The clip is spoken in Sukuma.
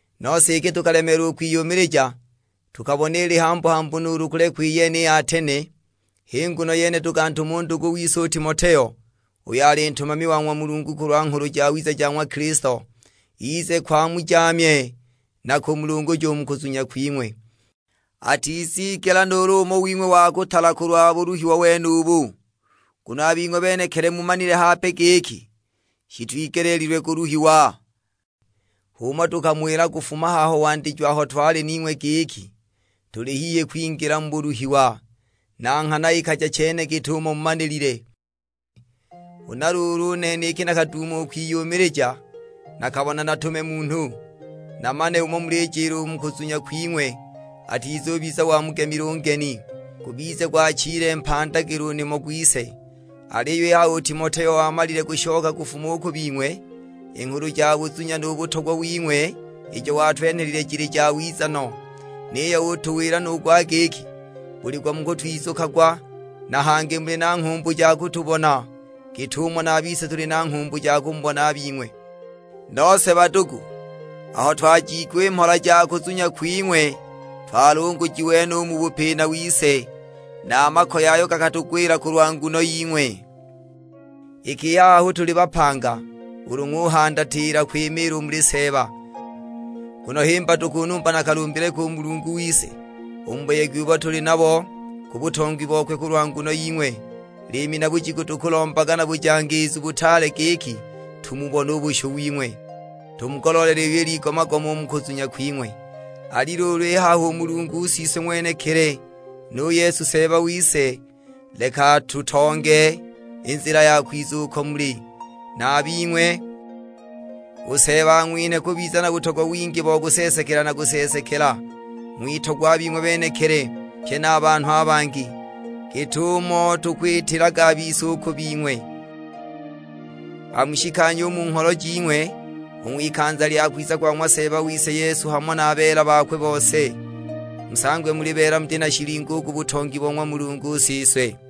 Nose iki tukalemeelwa u kwiyumilija, tukabona ili hambu-hambu nuulu kulekwa iyene i Atene. H'i nguno yene tukantuma u ndugu wise u Timoteo, uyo ali ntumami wa ng'wa Mulungu kulwa Nghulu Jawiza ja ng'wa Kilisto, ize ko amujaamye na kumulunguja u mu kuzunya kwing'we; atizigela nuulu umo wing'we wa kutala kulwa buluhiwa wenubu. Nguno a bing'we benekili mumanile hape giki shitwigeleelilwe kuluhiwa. H'umo tukamuwila kufuma haho wandijo aho twali ning'we, giki tuli hihi kwingila mu buluhiwa; na nghana ikaja chene git'umo mumanilile. Huna luulu u nene iki nakaduuma u kwiyumilija, nakabona natume munhu, namane umo mulijila u mu kuzunya kwing'we; atizubiza wamugemile u ngemi, gubize gwachile mpandagilo u nimo gwise. Aliyo i haha u Timoteo wamalile kushoka kufuma u ku bing'we, i nghulu ja buzunya nu butogwa wing'we ijo watwenhelile jili jawiza no, niyo utuwila nu gwa giki buli gwa mukutwizukagwa; na hangi muli na nghumbu ja kutubona git'umo na a bise tuli na nghumbu ja kumubona a bing'we. Nose badugu, aho twajiigwa i mhola ja kuzunya kwing'we twalungujiwe no u mu bupina wise, na a makoye ayo gakatugwila kulwa nguno ying'we. Iki i haha hu tuli bapanga, ulu ng'uhandatila kwimiila u muli Seeba. Nguno himba tukunumba na kalumbile ki u Mulungu wise, u mu buyegi ubo tuli nabo ku butongi bokwe kulwa nguno ying'we! Liimi na bujiku tukulombaga na bujangiizu butaale giki tumubone u bushu wing'we, tumugoloolele iyo iligoma-goma u mu kuzunya kwing'we. Ali luulu i haha u Mulungu Siswe ng'wenekili, nu Yesu Seeba wise, leka atutonge i nzila ya kwiza uko muli. Na a bing'we, u Seeba ang'winhe kubiza na butogwa wingi bo kuseesekela na kuseesekela, ng'witogwe a bing'we benekili, pye na a banhu a bangi, git'umo tukwitilaga a bise u ku bing'we. Amushikanye u mu ngholo jing'we, u ng'wikanza lya kwiza kwa ng'wa Seeba wise Yesu hamo na beela bakwe bose, musangwe muli beela muti na shilingo u ku butongi bo ng'wa Mulungu Siswe.